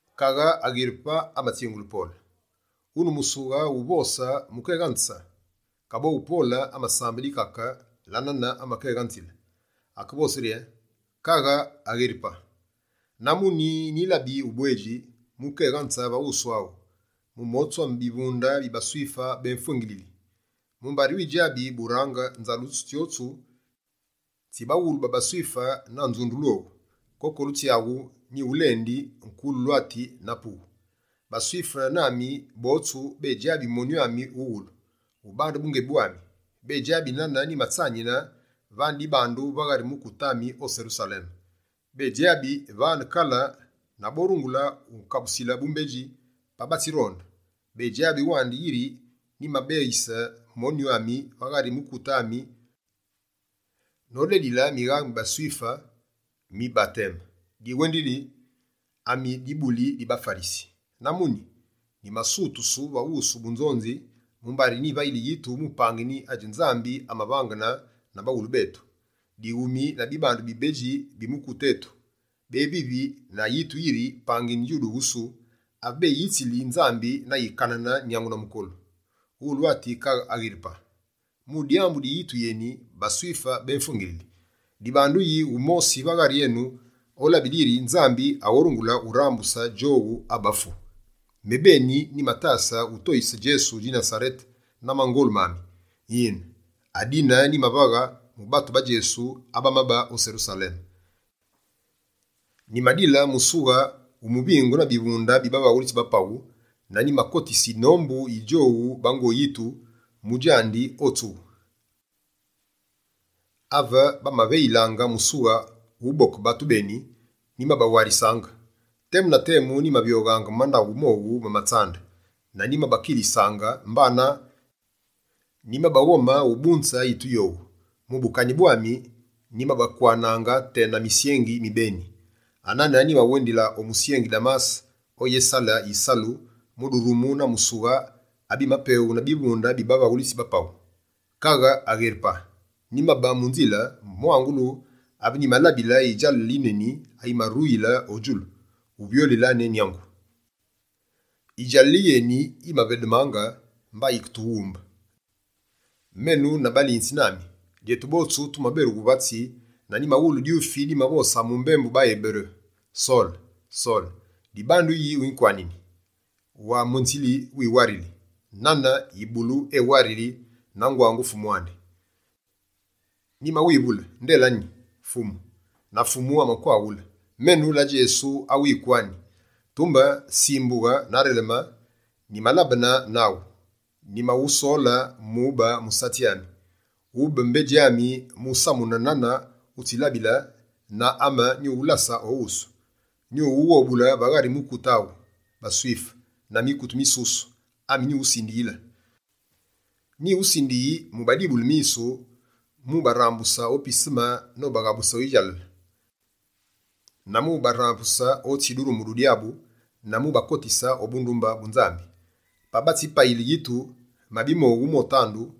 Kaghe Agheripa amatsingule Pole: «Wune musughe wu uvose mu kéghanze.» Kaboghu Pole amasambe dikake la nane amakéghanzile. Akevose rye: «Kaghe Agheripa, na muni nyilabi ubwedji mu ukéghanze va wusu aghu, mu motsu ame bivunde bi baSwife bémfwengilili. Mumbari widjabi burange nzalusulu tsyotsu tsi baghulu ba baSwife na nzundulu owu. Kokolu tsyaghu, nyighulendi kululwati na pughu. BaSwife nami botsu bédjabi monyu ami wughulu, ubande bungebi bwami. Bédjabi nane nyimatsanine vane dibandu va ghari mukute ami o Serusaleme. Bénzyabi vane kale na borungule unkabusile bumbedji, pa batsironde. Bédjabi wandi, yiri nyimabeyise monyu ami va ghari mukute ami nodedili mighaghe mi baSwife mi bateme, diwendili yi: ami dibuli di baFarisi. Na muni, nyimasutusu va wusu bunzonzi, mumbari nyivayili yitu mu pangini adji Nzambi amavangene na baghulu betu. Dighumi na bibandu bibedji bi mukute etu, bévivi na yitu yiri pangini djuduwusu, ave béyitsili Nzambi na yikanene nyangu na mukolu. Wulwati kaghe Agheripa! Mu dyambu di yitu yeni, baSwife bémfwengilili. Dibandu yi wumosi va ghari enu, olabile yiri Nzambi aghorungule urambuse djowu abafu? Mebeni, nyimatase utoyise Djesu mwise Nasarete na mangolu mami. Yine, adine nyimavaghe mu batu ba Djesu abamabe o Serusaleme. Nyimadile musughe wu muvingu na bivunde bi bavaghulitsi ba paghu, na nyimakotise yinombu yi djowu bango yitu mu djandi o tsughu. Ave bamaveyilaange musughe wu uboke batu beni, nyimabawarisaange. Temu na temu, nyimavyoghaange mu mandaghu mowu ma tsambu, na nyimabakilisaange mbana nyimabaghome ubunze yitu yowu. Mu bukanyi bwami, nyimabakwanaange tena misyengi mi beni.» «Anane nyimawendile o musyengi Damase oyésale yisalu, mu durumu na musughe abimapeghu na bivunde bi bavaghulitsi ba paghu. Kaghe Agheripa, nyimabe mu nzile, mwangulu ave nyimalabile yidjalale yineni ayimaruyile o djulu, uvyolile ne nyangu. Yidjalale yeni yimavedemaange mba yiketughumbe, menu na balinzi nami. Djetu botsu tumaberughe vatsi na nyimawulu dyufi dimavose mu mbembu baEberu: “Sole, Sole, dibandu yi winkwanini? Wa mwenzile wiwarili, nane yibulu ewarili na ngwangu fumu andi.” Nyimawivule: “Nde la nyi, Fumu?” Na Fumu amakwaghule: “Menu la Djesu, awu wikwani. Tumbe simbughe na releme, nyimalabene naghu, nyimawusole mu ube musatsi ami. Wube mbedji ami mu usamune nane wutsilabile na ame nyuwulase o wusu. Nyuwughobule va ghari mukute aghu, baSwife na mikute misusu ami nyuwusindiyile. Nyiwusindiyi mu ubadibule misu, mu ubarambuse o piseme nobaghabuse o yidjalale, na mu ubadusule otsi durumu du Dyabu na mu ubakotise o bundumbe bu Nzambi. Pa batsimpayile yitu, mabi mowu motandu,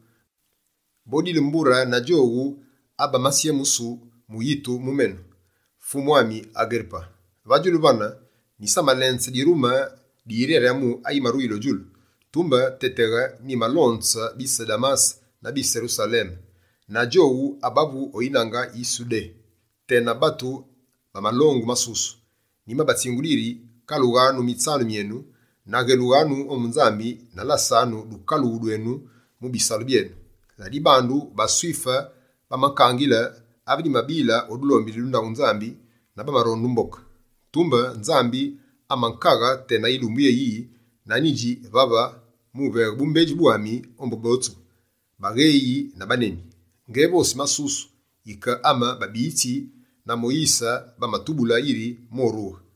bodile mbure na djowu abamatsyemusu mu yitu mu menu.”» «Fumu ami Agheripa, va djulu vane, nyisamalenze dirume di yiryaryamu ayimaruyile o djulu. Tumbe téteghe, nyimalonze bise Damase na bise Serusaleme, na djowu abavu o yinange yi Sudé, tena batu ba malongu masusu. Nyimabatsingule yiri: “Kalughanu mutsanu enu, na ghélughanu ombu Nzambi na lasanu dukalughu dwenu mu bisalu byenu.” Ladibandu, baSwife bamakangile ave nyimabile o dulombili du ndaghu Nzambi na bamaronde umboke. Tumbe Nzambi amakaghe tena yilumbu yéyiyi na nyidji vave mu uveghe bumbedji bwami ombu botsu: bagheyi na baneni. Ngévosi masusu yike ame babiyitsi na Moyise bamatubule yiri morughe.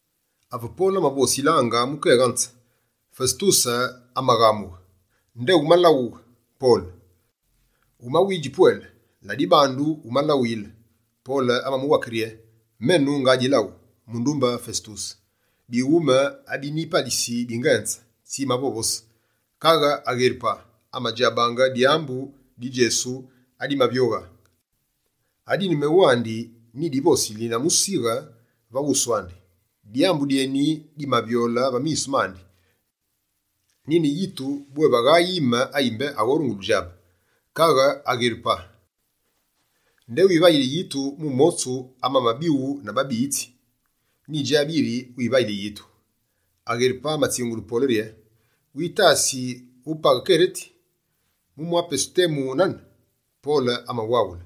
Ave Pole amavosilaange mu kéghanze, Fesetuse amaghamughe: «Nde wumalawughe, Pole! Wumawidji pwele, la dibandu wumalawuyile.» Pole amamuwake rye: «Menu nga dilaghu, mundumbe Fesetuse. Bighume abinyipalisi bingenze tsi mavovose. Kaghe Agheripa amadjabaange dyambu di Djesu adimavyoghe, adine mewandi ni divosili na musighe va wusu andi. Dyambu dyeni dimavyole va misu mandi, nine yitu bwé vagha yime ayi mbé aghorungule udjabe. Kaghe Agheripa, nde wivayili yitu mu motsu amamabighu na babiyitsi? Nyidjabi yiri wimavayili yitu!» Agheripa amatsingule Pole rye: «Witasi wupaghe Kereti, mu mwa pesu temu nane?» Pole amawaghule: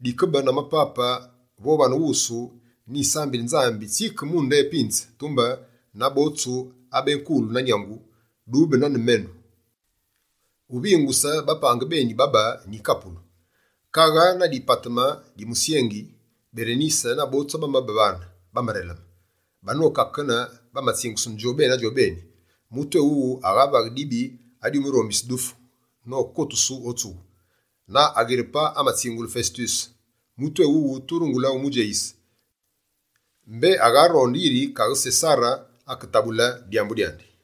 «Dikebe na mapape vo vane wusu, nyisambili Nzambi tsike mu nde pinze, tumbe na botsu abénkulu na nyangu, dube nane menu, uvinguse bapange beni babe nyikapulu.» Kaghe na dipateme di musyengi, Berenise na botsu abamabe vane, bamareleme. Banokakene, bamatsingusene djobeni na djobeni: «Mutu éwuwu aghavaghe dibi adyumurombise dufu nokotusu o tsughu.» Na Agheripa amatsingule Fesetuse: «Mutu éwuwu turungule umudjeyise, mbé agharonde yiri kaghe Sesare aketabule dyambu dyandi.»